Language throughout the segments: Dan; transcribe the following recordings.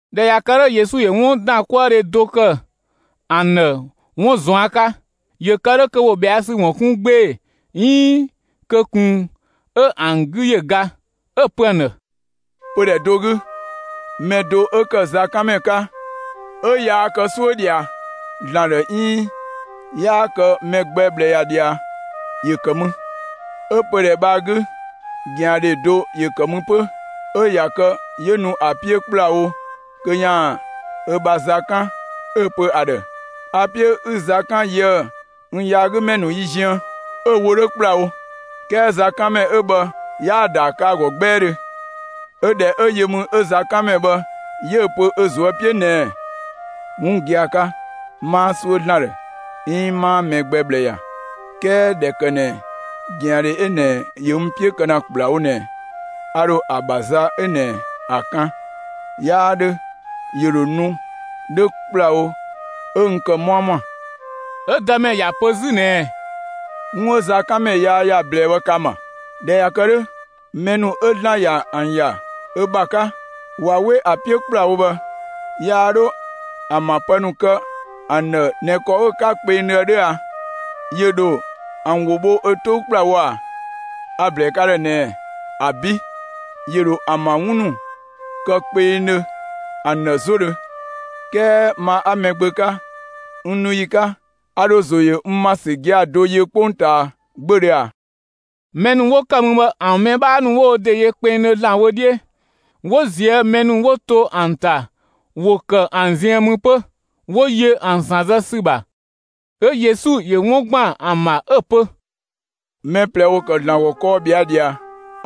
꞊Dhɛ ꞊ya kë 'dhö, Yesu ‑yö 'wundankuëdhe do ‑kë ‑an ‑dhë 'wun ꞊zuan' 'ka, ‑yö kë 'dhö kö ‑wo ꞊bhɛa' ‑sü ‑wun 'kun 'gbee‑ 'iin kö ꞊kun 'ö ‑an 'gü ‑yö ga; 'ö‑ pö ‑an ‑dhë: «Pödhɛ do 'gü, mɛ do 'ö ‑kë zakanmɛ 'ka 'ö 'yaa kë 'suö ꞊dhia ‑Zlan ‑dhë 'iin 'yaa kë mɛ gbɛ ꞊bhlë ‑ya ꞊dhia, ‑yö ‑kë mü. 'Ö pödhɛ bhë ‑a 'gü, ꞊gɛandhe do ‑yö ‑kë mü 'pö. 'Ö ꞊ya kë 'yö nu ‑a 'piö ‑kplawo kö ‑yaan ö bha za 'kan 'ö‑ pö ‑a ‑dhë: ‹A‑ 'piö 'ü za 'kan yië‑ n yaagümɛ ‑nu yi ziën.› 'Ö‑ wo 'dhö ‑kplawo, 'kɛɛ zakanmɛ 'ö bhë 'yaa‑ ‑daa kë ‑a ‑gɔ 'gbɛɛdhö; 'yö ꞊dhɛ 'ö yö mü 'ö zakanmɛ bhë 'yö‑ pö ö ꞊zuö' 'piö ꞊nɛɛ: ‹'Wun gia‑ 'ka, 'maa 'suö ‑Zlan ‑dhë 'iin 'maa mɛ gbɛ ꞊bhlë ‑ya, 'kɛɛ ꞊dhɛ ‑kë ꞊nɛ ꞊gɛandhe 'ö ꞊nɛ ‑yö n 'piö kë ‑na ‑kplawo ꞊nɛ, a ‑dho ‑a ‑bha za 'ö ꞊nɛ ‑a kan, 'yaa 'dhö ‑yö ‑dho nu 'dhö ‑kplawo 'ö n ‑kë 'muamua.›» 'Ö Dëmɛ ‑ya pö 'zü ꞊nɛɛ: «'Wun 'ö zakanmɛ yaa ‑ya ꞊blɛɛ bhë ka‑ ‑ma! ꞊Dhɛ ꞊ya kë 'dhö, mɛ ‑nu 'ö ‑Zlan ‑yö ‑an ‑ya ö ‑bha 'ka, ꞊wa 'we ‑a 'piö ‑kplawo bhë, yaa 'dho ‑an ‑bha pë ‑nu kë ‑an ‑dhë ꞊nɛ ‑kɔ 'ö‑ 'ka kpengdhö ‑a 'dhö ‑a? ‑Yö ‑dho ‑an ‑wo bho ö 'tou ‑kplawo ꞊a? A‑ ‑blɛɛ ka ‑dhë ꞊nɛɛ: ‑Abi', ‑yö ‑dho ‑an ‑bha 'wun ‑nu kë kpengdhö ‑an ‑dhë 'zodhö. 'Kɛɛ ma 'a Mɛgbö 'ka, n nu ‑yi 'ka, a ‑dho ‑zo ‑yö n ‑ma ‑sü gia‑ do yö 'kpongtaa 'gbödhö ꞊a?» Mɛ ‑nu 'wo ‑kë mü bhë, ‑an mɛ 'bhaa ‑nu 'wo wo ‑de yö kpengdhö ‑Zlan wö 'dhiö, 'wo ꞊zië' mɛ ‑nu 'wo to ‑an ‑ta ‑wo ‑kë ‑an ziën mü 'pö, 'wo yö ‑an ‑san zë ‑sü ‑bha. 'Ö Yesu ‑yö 'wun ‑gban ‑an ‑bha, ö‑ pö: «Mɛ ꞊plɛ ‑wo ‑kë ‑Zlan ‑gɔ kɔɔ ꞊bhɛa' ꞊dhia.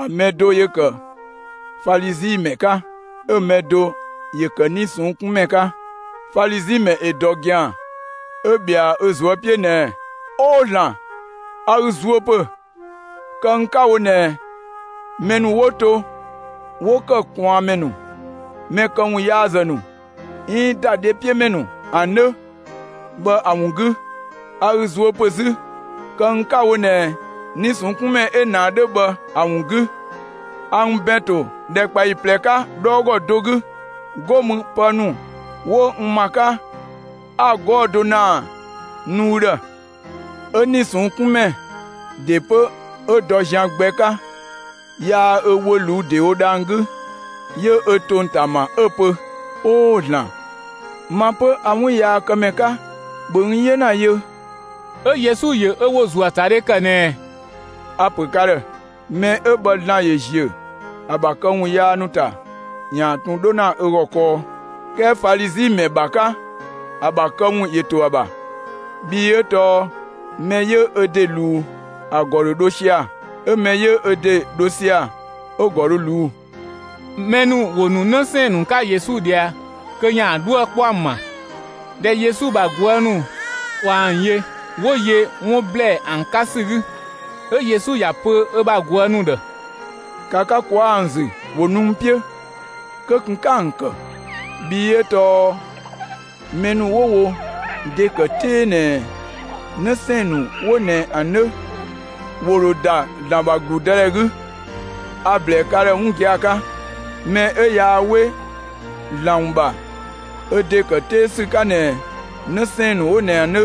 ‑A mɛ do ‑yö ‑kë Falizi ‑mɛ 'ka, 'ö‑ mɛ do ‑yö ‑kë 'nii‑ ꞊sɔnng' 'kun ‑mɛ 'ka. Falizi ‑mɛ ‑yö ‑dɔ ‑gɛan, 'ö ꞊bhɛa ö ꞊zuö' 'piö ꞊nɛɛ: ‹Oo ‑Zlan, a ü zuö ‑pö, kë n 'ka‑ wo ꞊nɛ mɛ ‑nu 'wo to 'wo ‑kë ꞊kwaanmɛ ‑nu, mɛ këwunyaazë ‑nu, 'iin ‑dadhepiömɛ ‑nu ‑an 'dhö bhë ‑a ‑wun 'gü. A ü zuö ‑pö 'zü, kë n 'ka‑ wo ꞊nɛ 'nii‑ ꞊sɔnng' 'kun ‑mɛ 'ö ꞊nɛ ‑a 'dhö bhë ‑a ‑wun 'gü. A n ‑bɛn ‑to ‑dhɛkpaɔyi ꞊plɛ 'ka 'dhɔɔgɔ do 'gü, 'go mü pë ‑nu 'wo n ‑ma 'ka 'a‑ kë 'gɔɔ‑ do ‑naa ‑nu ü ‑dhë.› 'Ö 'nii‑ ꞊sɔnng' 'kun ‑mɛ ‑de 'pö 'yö dɔ zian gbɛ 'ka, 'yaa ö wö ꞊luu'‑ ‑dewo dhang‑ 'gü, 'yö ö ‑tong ‑ta ‑ma 'ö ‑pö: ‹Oo ‑Zlan, ma 'pö a 'wunyaakëmɛ 'ka, ‑bhö n 'yena yö!›» 'Ö Yesu ‑yö ö ‑wo ‑zuöatadhe ‑kë ꞊nɛɛ: «A‑ ‑pö ka ‑dhë: Mɛ 'ö bhë ‑Zlan ‑yö ‑ziö ‑a ‑bha këwun yaa ‑nu ‑ta ‑yaan ꞊tun 'dho ‑na ö ‑gɔ kɔɔ, 'kɛɛ Falizi ‑mɛ ‑bha 'ka, ‑a ‑bha këwun ‑yö ‑to ‑a ‑bha. Bhii 'ö tɔɔ mɛ 'yö ö ‑de ꞊luu'‑, ‑a ‑gɔ ‑yö ‑dho dho sia‑, 'ö mɛ 'yö ö ‑de 'dho sia‑, 'ö‑ ‑gɔ dho ꞊luu'‑.» Mɛ ‑nu ‑wo ‑nu 'në 'sɛɛn‑ ‑nu 'ka Yesu ꞊dhia kö ‑yaan 'dhuë‑ 'kpɔ ‑an ‑bha. ꞊Dhɛ Yesu ‑bha ꞊guë' ‑nu ꞊wa ‑an yö, 'wo yö 'wun ‑blɛɛ ‑an 'ka ‑sü 'gü. 'Ö Yesu ‑ya ‑pö ö bha ꞊guë' ‑nu ‑dhë: «‑Ka ka ꞊kwaa' ‑an ‑zü, ‑wo nu n 'piö! Kö ꞊kun 'ka ‑an ‑kë! Bhii 'ö tɔɔ mɛ ‑nu 'wo wo ‑de ‑kë 'tee ꞊nɛ 'në 'sɛɛn‑ ‑nu 'wo ꞊nɛ ‑an 'dhö, ‑wo ‑dho ‑da ‑Zlan ‑bha ‑gludëdhɛ 'gü. A‑ ‑blɛɛ ka ‑dhë 'wun gia‑ 'ka: Mɛ 'ö yaa 'we ‑Zlan ‑wun ‑bha ö ‑de ‑kë 'tee ‑sü 'ka ꞊nɛ 'në 'sɛɛn‑ ‑nu 'wo ꞊nɛ ‑an 'dhö,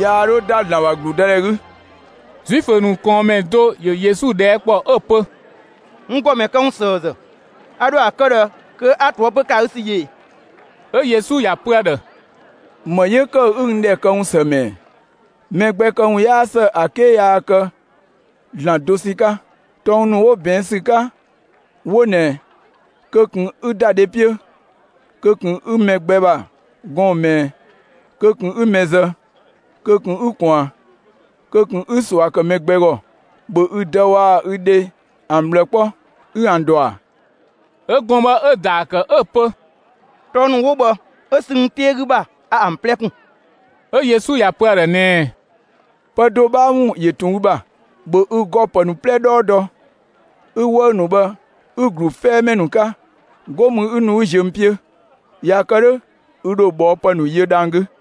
yaa 'dho ‑da ‑Zlan ‑bha ‑gludëdhɛ 'gü.» Zuifö ‑nu ꞊kɔɔnmɛ do ‑yö Yesu ꞊dhɛɛ' ‑kpɔ 'ö‑ pö: «N ‑Gɔmɛ këwunsëëzë, a ‑dho ‑a kë ꞊dhë kö 'a ꞊toëpö ‑kë ‑a 'gü ‑sü yö ꞊e?» 'Ö Yesu ‑ya pö ‑a ‑dhë: «‑Më 'yö ‑kë 'ü n ‑dhɛ këwun ‑së ‑mɛ ‑ɛ? Mɛ gbɛ këwun 'yaa ‑së ‑a 'ke yaa kë ‑Zlan dosɛn 'ka. Tɔng ‑nu 'wo ꞊bɛɛn' ‑sü 'ka 'wo ꞊nɛ: Kö ꞊kun 'ü ‑da dhe 'piö; kö ꞊kun 'ü mɛ gbɛ ‑bha gɔɔn‑ ꞊mɛɛ; kö ꞊kun 'ü mɛ zë; kö ꞊kun 'ü ꞊kwaan; kö ꞊kun 'ü ꞊sua ‑kë mɛ gbɛ ‑gɔ; ‑bhö ü dë waa‑ ü dhe ‑an ꞊bhlë 'kpɔ, ü ‑an ‑dɔ ‑a?» 'Ö gɔɔn‑ bhë 'ö‑ ‑daa ‑kë 'ö‑ pö: «Tɔng ‑nu 'wo bhë 'ö sü n 'tee 'gü ‑bha a ‑an 'plɛ ‑kun.» 'Ö Yesu ‑ya pö ‑a ‑dhë ꞊nɛɛ: «Pë do 'bhaa ‑wun ‑yö ꞊tun ü ‑bha: ‑Bhö ü ‑gɔ pë ‑nu 'plɛ 'dhɔɔ dɔ 'ü‑ 'wëü‑ ‑nu bhë 'ü‑ ‑glu 'fɛɛmɛ ‑nu 'ka; 'go mü 'ü nu 'ü ziö n 'piö! ꞊Ya kë 'dhö ü ‑dho ꞊bhɔɔpë ‑nu yö dhang‑ 'gü.»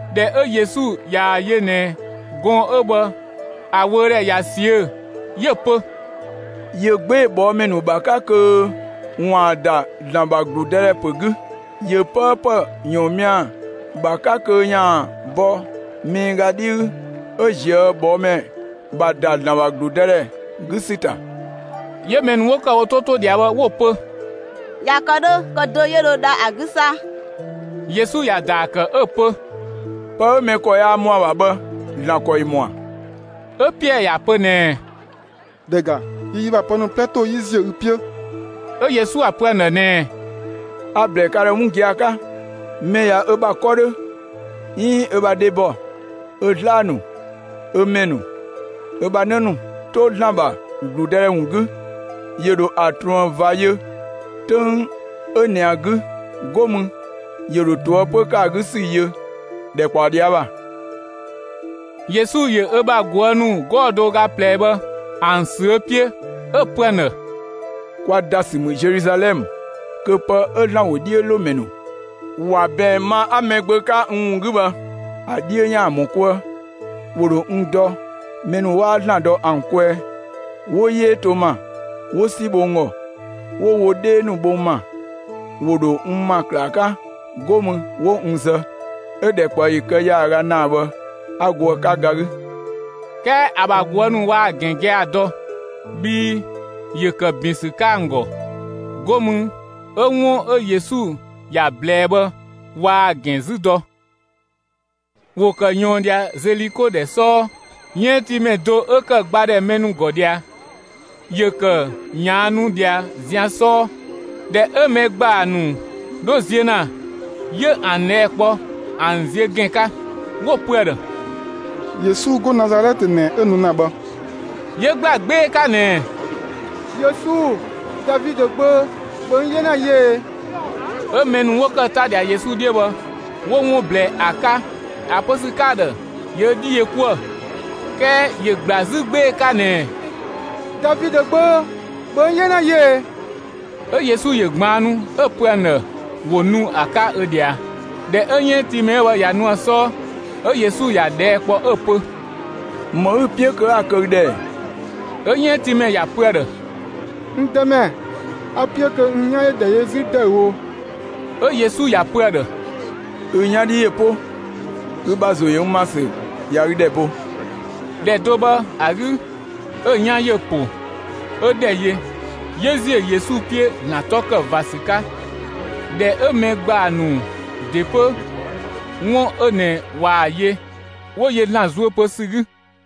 ꞊Dhɛ 'ö Yesu ꞊yaa‑ yö ꞊nɛ gɔɔn‑ 'ö bhë ‑a wöödhɛ ꞊ya ꞊siö'‑, 'yö‑ pö: «‑Yö 'gbee‑ ꞊bhɔɔmɛ ‑nu ‑bha 'ka kö ‑waan ‑da ‑Zlan ‑bha ‑gludëdhɛ ‑pö 'gü. ‑Yö 'pëëpë ‑yɔɔnmia ‑bha 'ka kö ‑yaan bɔ miiga 'dhi 'gü 'ö ꞊zië' ꞊bhɔɔmɛ ‑bha ‑da ‑Zlan ‑bha ‑gludëdhɛ 'gü ‑sü ‑ta.» 'Yö mɛ ‑nu 'wo ‑kë wo 'to 'to ꞊dhia bhë 'wo‑ pö: «꞊Ya kë 'dhö kö dö 'yö dho dha ‑a 'gü 'sa?» Yesu ‑ya ‑daa ‑kë 'ö‑ pö: «Pë 'ö mɛ ‑kɔ yaa ‑mɔ ‑a ‑bha bhë, ‑Zlan ‑kɔ ‑yö ‑mɔa.» 'Ö Piɛɛ ‑ya pö ꞊nɛɛ: «‑Dhɛ ‑ga, yi yi ‑bha pë ‑nu 'plɛ ‑to 'yi ziö ü 'piö!» 'Ö Yesu ‑ya pö ‑an ‑dhë ꞊nɛɛ: «A‑ ‑blɛɛ ka ‑dhë 'wun gia‑ 'ka: Mɛ ꞊ya ö bha 'kɔ 'dhö 'iin ö bha dhebɔ, ö 'zlaa‑ ‑nu, ö ‑mɛ ‑nu, ö bha 'në ‑nu 'to ‑Zlan ‑bha ‑gludëdhɛ ‑wun 'gü, ‑yö ‑dho ‑a ꞊truën ꞊va yö 'töng 'ö ꞊nɛ ‑a 'gü, 'go mü 'yö dho ꞊toëpö ‑kë ‑a 'gü ‑sü yö ‑dhɛ ꞊kpaɔ ꞊dhia' ‑bha.» Yesu ‑yö ö bha ꞊guë' ‑nu 'gɔɔ‑ do ö ga ꞊plɛ 'wo bhë ‑an ‑sü ö 'piö 'ö‑ pö ‑an ‑dhë: «Kwa ‑da ‑sü ‑mü Zeluzalɛmë kö pë 'ö ‑Zlan ‑wodhiölomɛ ‑nu ‑wa ꞊bɛɛn ma 'a Mɛgbö 'ka n ‑wun 'gü bhë, ‑a 'dhiö ‑yaan ‑mɔ 'kuë. ‑Wo ‑dho n dɔ mɛ ‑nu 'waa ‑Zlan dɔ ‑an kwɛɛ, 'wo 'yee to n ‑ma, 'wo 'si bho n ‑gɔ, 'wo wo 'dhee ‑nu bho n ‑ma, ‑wo ‑dho n ‑ma ‑klaa 'ka, 'go mü 'wo n zë; 'ö‑ ‑dhɛkpaɔyi kë ‑yaaga ‑naa bhë 'a go ‑a 'ka ga 'gü.» 'Kɛɛ ‑a ‑bha ꞊guë' ‑nu waa‑ ‑gɛn gia‑ dɔ; bhii ‑yö ‑kë ‑bin ‑sü 'ka ‑an ‑gɔ, 'go mü 'ö 'wun 'ö Yesu ‑ya ꞊blɛɛ bhë waa‑ ‑gɛn 'zü dɔ. ‑Wo ‑kë ꞊yɔɔn ꞊dhia Zeliko ‑dhɛ 'sɔɔ. 'Yënngtiimɛ do 'ö ‑kë ‑gba ‑dhɛ mɛ ‑nu ‑gɔ ꞊dhia, ‑yö ‑kë ꞊yaannu ꞊dhia zian 'sɔɔ. ꞊Dhɛ 'ö mɛ ‑gbaa ‑nu 'dho ziö ‑na, 'yö ‑an ꞊dhɛɛ' kpɔ ‑an ziö ‑gɛn 'ka. 'Wo‑ pö ‑a ‑dhë: «Yesu 'go Nazalɛtë ꞊nɛ 'ö nu ‑na bhë.» 'Yö ‑gbla 'gbee‑ 'ka ꞊nɛɛ: «Yesu Davidö gbö, ‑bhö n 'yena yö ꞊ee!» 'Ö mɛ ‑nu 'wo ‑kë 'ta ꞊dhia Yesu 'dhiö bhë 'wo 'wun ꞊blɛɛ ‑a 'ka ‑a pö ‑sü 'ka‑ ‑dhë ‑yö ö 'dhi yö 'kuë‑, 'kɛɛ ‑yö ‑gbla 'zü 'gbee‑ 'ka ꞊nɛɛ: «Davidö gbö, ‑bhö n 'yena yö ꞊ee!» 'Ö Yesu ‑yö ꞊gbaannu 'ö‑ ‑pö ‑an ‑dhë ‑wo nu ‑a 'ka ö ꞊dhia. ꞊Dhɛ 'ö 'yënngtiimɛ 'ö bhë ꞊ya nu ‑a 'sɔɔ, 'ö Yesu ‑ya ꞊dhɛɛ' kpɔ 'ö‑ pö: «‑Më 'ü‑ 'piö kö 'a‑ kë ü ‑dhë ‑ɛ?» 'Ö 'yënngtiimɛ ‑ya pö ‑a ‑dhë: «N Dëmɛ, a‑ 'piö kö n 'yan ‑yö ‑dhɛ yö 'zü ‑dëüwo.» 'Ö Yesu ‑ya pö ‑a ‑dhë: «Ü 'yan 'dhi ‑yö 'po! Ü ‑bha ‑zo ‑yö n ‑ma ‑sü ꞊ya ü ‑dhɛ bo!» ‑Dhɛ do bhë ‑a 'gü, 'ö‑ 'yan ‑yö ‑po, 'ö ‑dhɛ yö, 'yö ‑ziö Yesu 'piö ‑Zlan 'tɔ kë ꞊va ‑sü 'ka. ꞊Dhɛ 'ö mɛ ‑gbaa ‑nu ‑de 'pö 'wun 'ö ꞊nɛ ꞊waa‑ yö, 'wo yö ‑Zlan zuö pö ‑sü 'gü.